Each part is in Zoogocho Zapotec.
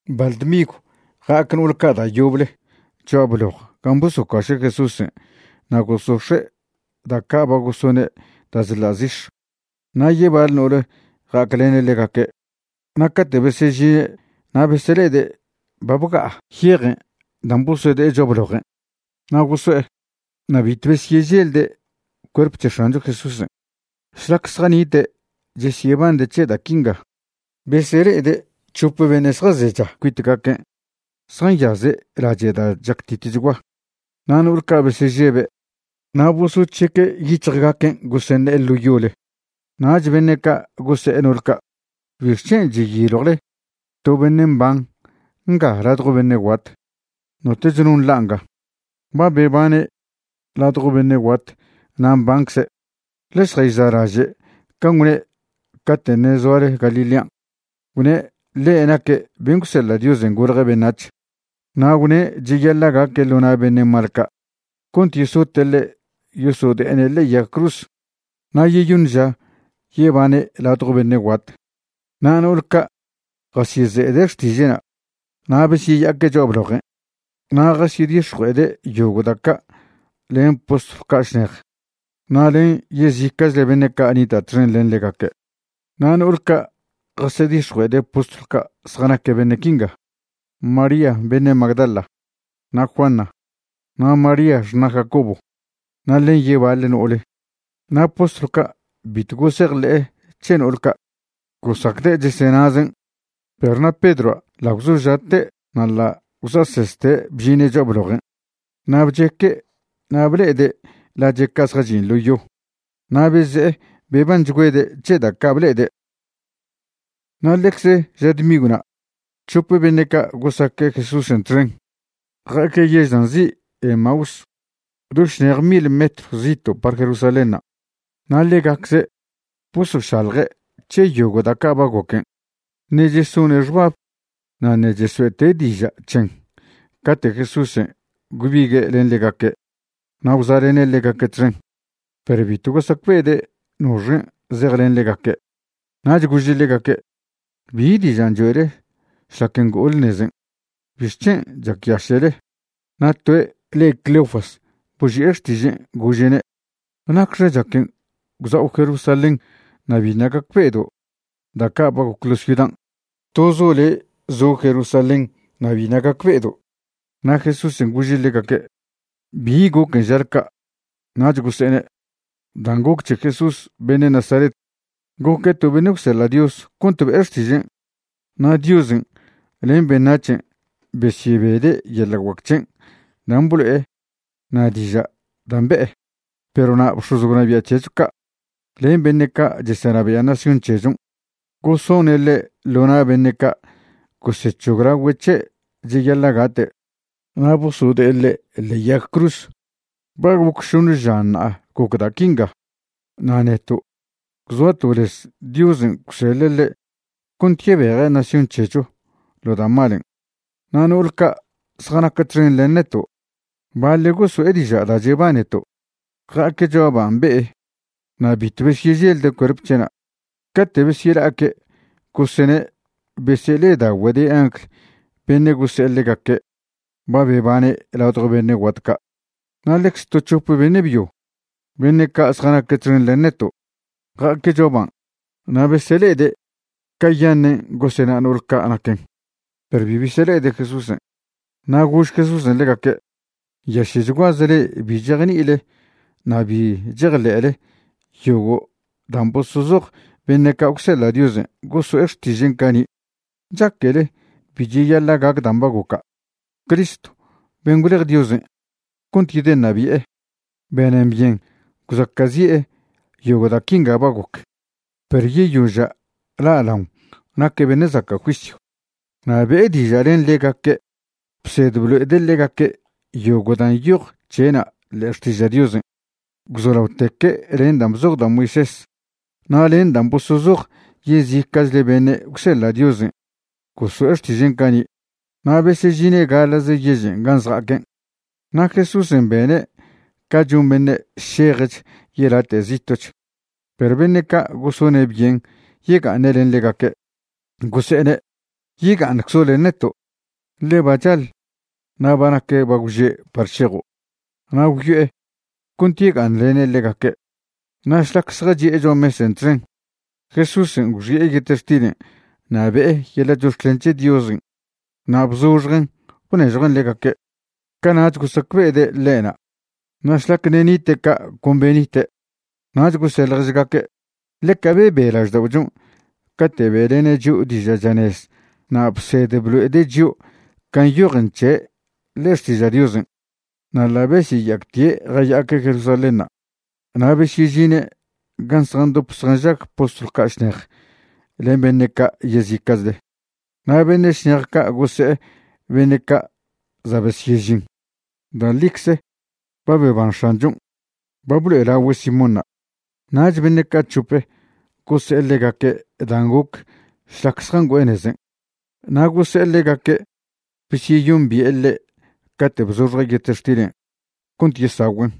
Baḻ dmigw ja'ac no'ol ca' da' yoble cho'a bloj gan' bosocuaše' Jesúsen' na' gosox̱e' da' ca' ba gosone' da' chḻa' zix̱, na' yebaḻ no'ole ja'aclene' ḻegaque'. Na' cate' besežine' na' besele'ede' ba bga'a yejen' dan' bosode'e cho'a blojen'. Na' goso'e, na' bitw besyeželde' cuerp c̱he X̱ancho Jesúsen'. Šlac zjanite' chesyebande' c̱he da' quinga, besele'ede' c̱hope beṉe' zjazecha cuitgaquen' zjanyaze' lache' da' chactitchgua. Na' no'ol ca' besežebe' na' bosoc̱heque' yic̱hjgaquen' goseṉe'e ḻo yole. Nach beṉe' ca' gose'e no'ol ca': ―¿Bixc̱hen' cheyiljwle to beṉe' mban nga ladjo beṉe' guat? Notoch no nḻa' nga. Ba bebane' ladjo beṉe' guat na' mbancze'. Ḻe šjayza'laže' can' gwne' cate' ṉe' zoale Galilean'. Gwne' ḻe' naque' ben' gwseḻa' Diosen' golje' beṉac̱h. Na' gwne' cheyaḻa' gaque' ḻo na' beṉe' mal ca' cont yesote' ḻe' yosode'ene' ḻe'e yag cruz, na' yeyoṉ ža yebane' ladjo beṉe' guat. Na' no'ol ca' jasyeze'ede' xtiže'na'. Na' besyeya'aque' cho'a blojen' na' jasedix̱jue'ede' yogo' da' ca' len postlw ca' šnej na' len yezica'chle beṉe' ca' nita' txen len ḻegaque'. Na' no'ol ca' jasedix̱jue'ede' postlw ca' zjanaque' beṉe' quinga: María beṉe' Magdala, na' Juana, na' María xṉa' Jacobo, na' len yebaḻe no'ole. Na' postlw ca' bitw gosejḻe'e c̱he no'ol ca', gosacde' chesenazen'. Perw na' Pedroa' ḻa' gwzoža'te' na' ḻa' gwza'seste' bžine' cho'a blojen' na' bcheque' na' ble'ede' lache' ca' zjachin' ḻo yo. Na' beze'e bebanchgüede' c̱he da' ca' ble'ede'. Na' ḻecze ža dmigwna' c̱hop beṉe' ca' gosaque' Jesúsen' txen ja'aque' yež dan' nzi' Emaús, do šnej mil metr zito' par Jerusalénṉa'. Na' ḻegacze' bosošalje' c̱he yogo' da' ca' ba goquen'. Ṉe' chesone' xbab na' ṉe' chesoe'te' diža' c̱hen cate' Jesúsen' gwbigue' len ḻegaque' na' gwza'lene' ḻegaque' txen, perw bitw gosacbe'ede' noxen' zejlen ḻegaque'. Nach gože' ḻegaque': ―¿Bi dižan' choe'le šlac ngo'ole nezen'? ¿Bixc̱hen' chacyaše'le? Na' toe' le' Cleofas boži'e xtižen' gože'ne': ―¿Nacxe chaquen' gwza'o Jerusalén na' biṉa' gacbe'edo' da' ca' ba goc ḻo' ciudan'? ¡Tozo' le' zo' Jerusalén na' biṉa' gacbe'edo'! Na' Jesúsen' gože' ḻegaque': ―¿Bi goquen' žale ca'? Nach gose'ene': ―Dan' goc c̱he Jesús beṉe' Nazaret. Goque' to beṉe' gwseḻa' Dios cont be'e xtižen', na' Diosen' len beṉac̱hen' besyebede' yeḻa' guac c̱hen' dan' blo'e na' diža' dan' be'e. Perw na' bx̱oz gwnabia' c̱hecho ca' len beṉe' ca' chesenabia' nación c̱hechon' gosone' ḻe' ḻo na' beṉe' ca' gosec̱hoglagüe' c̱he' cheyaḻa' gate', na' bosode'e ḻe' ḻe'e yag cruz. Ba goc šoṉe ža ṉa'a goc da' quinga. Na' neto' gwzoato' lez Diosen' gwseḻe' ḻe' cont yebeje' nación c̱hecho ḻo da' malen'. Na' no'ol ca' zjanac txen len neto', baḻe' goso'e diža' da' chebaneto', ja'aque' cho'a ban' be'e na' bitw besyeželde' cuerp c̱he'na'. Cate' besyela'aque' gosene' besele'eda'ogüede' angl beṉe' gose'e ḻegaque' ba bebane' ladjo beṉe' guat ca'. Na' ḻecze to c̱hop beṉe' byo beṉe' ca' zjanaque' txen len neto' ja'aque' cho'a ban' na' besele'ede' cayaṉen' gosena no'ol ca' naquen, perw bi besele'ede' Jesúsen'. Na' gož Jesúsen' ḻegaque': ―Nyaše'chguaze le'e bi chejni'ile na' bi chejḻe'le yogo' dan' bosozoj beṉe' ca' gwseḻa' Diosen' goso'e xtižen' cani'. ¿Chaquele bi cheyaḻa' gac dan' ba goca'? Cristo ben' gwlej Diosen' cont yedeṉabi'e, benen byen gwzaca'zi'e yogo' da' quinga ba goc, perw yeyoža' la'laon naque' beṉe' zaca' juisyw. Na' be'e diža' len ḻegaque' bsed blo'ede' ḻegaque' yogo' dan' nyoj c̱he'na' ḻe'e Xtiža' Diosen', gwzolaoteque' len dan' bzoj da' Moisés na' len dan' bosozoj yezica'chle beṉe' gwseḻa' Diosen' goso'e xtižen' cani'. Na' besežine' gaḻa'ze yežen' gan' zja'aquen', na' Jesúsen' bene' ca chon beṉe' šejch yelate' zito'ch. Perw beṉe' ca' gosone' byen yega'aṉe' len ḻegaque', gose'ene': ―Yega'aṉczo' len neto', ḻe ba chaḻ na' ba nac bagwže' par šejo'. Na' gwyo'e cont yega'aṉlene' ḻegaque'. Na' šlac zjachi'e cho'a mesen' txen, Jesúsen' gwxi'e yetextilen' na' be'e yeḻa' chox̱clen c̱he Diosen' na' bzoxjen' bnežjuen' ḻegaque'. Cana'ch gosacbe'ede' ḻe'na'. Na' šlac ṉe' nite' ca' con beṉite'. Nach gose' ḻježgaque': ―Ḻeca bebe lažda'ochon' cate' be'lene' chio' diža' chanez na' bsed blo'ede' chio' can' nyojen c̱he' ḻe'e Xtiža' Diosen'. Na' ḻa' besyeya'actie' jaya'aque' Jerusalénṉa' na' besyežine' gan' zjandop zjanžag postlw ca' šnej len beṉe' ca' yezica'chle. Na' beṉe' šnej ca' gose'e beṉe' ca' za' besyežin: ―Da' ḻicze ba beban X̱anchon'. Ba blo'elagüe' Simónṉa'. Nach beṉe' ca' c̱hop gose'e ḻegaque' dan' goc šlac zjangüe'e nezen', na' gose'e ḻegaque' besyeyombi'e ḻe' cate' bzoxje' yetextilen' cont yesagüen'.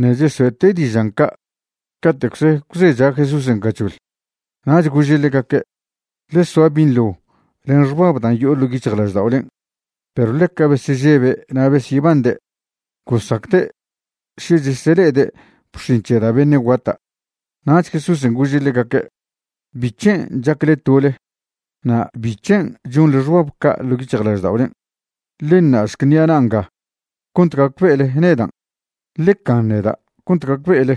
Ṉe' chesoe'te' dižan' ca', cate'cze gwzecha Jesúsen' gachoḻ. Nach gože' ḻegaque': ―Ḻe soa binḻo len xbab dan' yo'o ḻo' yic̱hjlažda'olen'. Perw ḻeca besežebe' na' besyebande', gosacde' še chesele'ede' bx̱in c̱he da' beṉe' guata'. Nach Jesúsen' gože' ḻegaque': ―¿Bic̱hen' chacle tole? na' ¿bic̱hen' chonḻe xbab ca' ḻo' yic̱hjlažda'olen'? Ḻe ṉa'šc ṉi'a na' nga cont gacbe'ele nedan'. Ḻe can neda' cont gacbe'ele.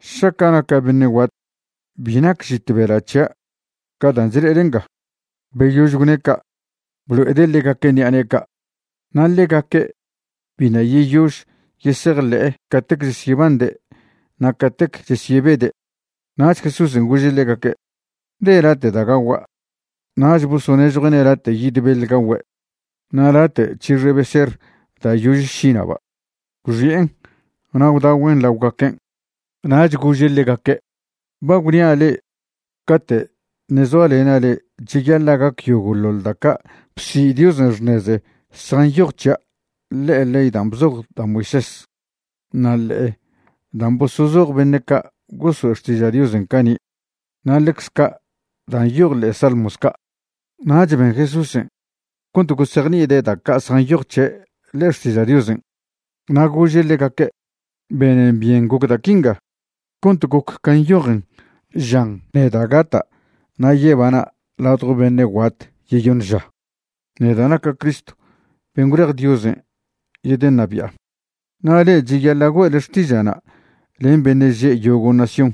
Šaca' naca' beṉe' guat, bi nac žit bela' c̱hia' ca dan' chle'ele nga. Beyož gwne' ca', blo'ede' ḻegaque' ṉi'a ne'e ca'. Na' ḻegaque' biṉa' yeyož yesejḻe'e catec chesyebande' na' catec chesyebede'. Nach Jesúsen' gože' ḻegaque': ―¿De late' da' gagua'? Nach bosonežjue'ne' late' yid beḻ gagüe' na' late' c̱hixe beser da' yože šina'ba'. Gwxi'en na' gwdagüen' laogaquen'. Nach gože' ḻegaque': ―Ba gwnia' le'e cate' ṉe' zoalena' le'e cheyaḻa' gac yogo'ḻoḻ da' ca' bsi' Diosen' xṉeze zjanyoj c̱hia' ḻe'e ley dan' bzoj da' Moisés, na' ḻe'e dan' bosozoj beṉe' ca' goso'e xtiža' Diosen' cani', na' ḻecz ca' da' nyoj ḻe'e Salmos ca'. Nach ben Jesúsen' cont gosejni'ide' da' ca' zjanyoj c̱he' ḻe'e Xtiža' Diosen'. Na' gože' ḻegaque': ―Benen byen goc da' quinga cont goc can' nyojen žan neda' gata' na' yebana' ladjo beṉe' guat yeyoṉ ža, neda' naca' Cristo ben' gwlej Diosen' yedeṉabia'. Na' le'e cheyaḻa' güe'le xtiža'na' len beṉe' že' yogo' nación.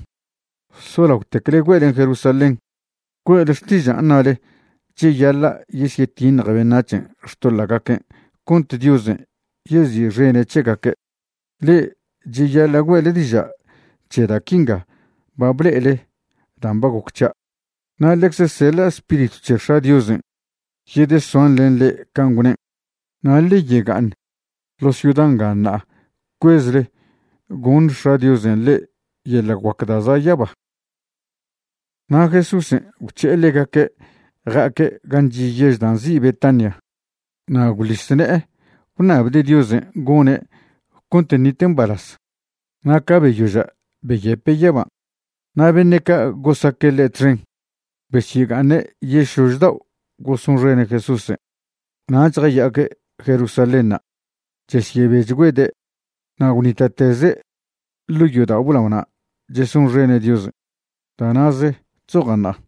Solaotecle güe'len Jerusalén. Güe'le xtižan' ṉale cheyaḻa' yesyetiṉje beṉac̱hen' xtoḻa'gaquen' cont Diosen' yezi'xene' c̱hegaque'. Le'e cheyaḻa' güe'le diža' c̱he da' quinga ba ble'ele dan' ba goc c̱hia'. Na' ḻecze seḻa' Spiritw c̱he X̱a' Diosen' yedesoan len le'e can' gwnen'. Na' ḻe yega'aṉ ḻo ciuda nga ṉa'a cuezle goṉ X̱a' Diosen' le'e yeḻa' guac da' za' yaba. Na' Jesúsen' gwc̱he'e ḻegaque' ja'aque' gan' chi' yež dan' nzi' Betania na' gwḻis ne'e gwṉabde' Diosen' gone' cont ṉite' mbalaz. Na' ca beyoža' beyepe' yaban'. Na' beṉe' ca' gosaque' ḻe' txen besyega'aṉe' yešlož dao' gosonxene' Jesúsen' nach jaya'aque' Jerusalénṉa', chesyebechgüede'. Na' gwnita'teze' ḻo' yodao' blaona' chesonxene' Diosen'. Da' na'ze chzoja' ṉa'a.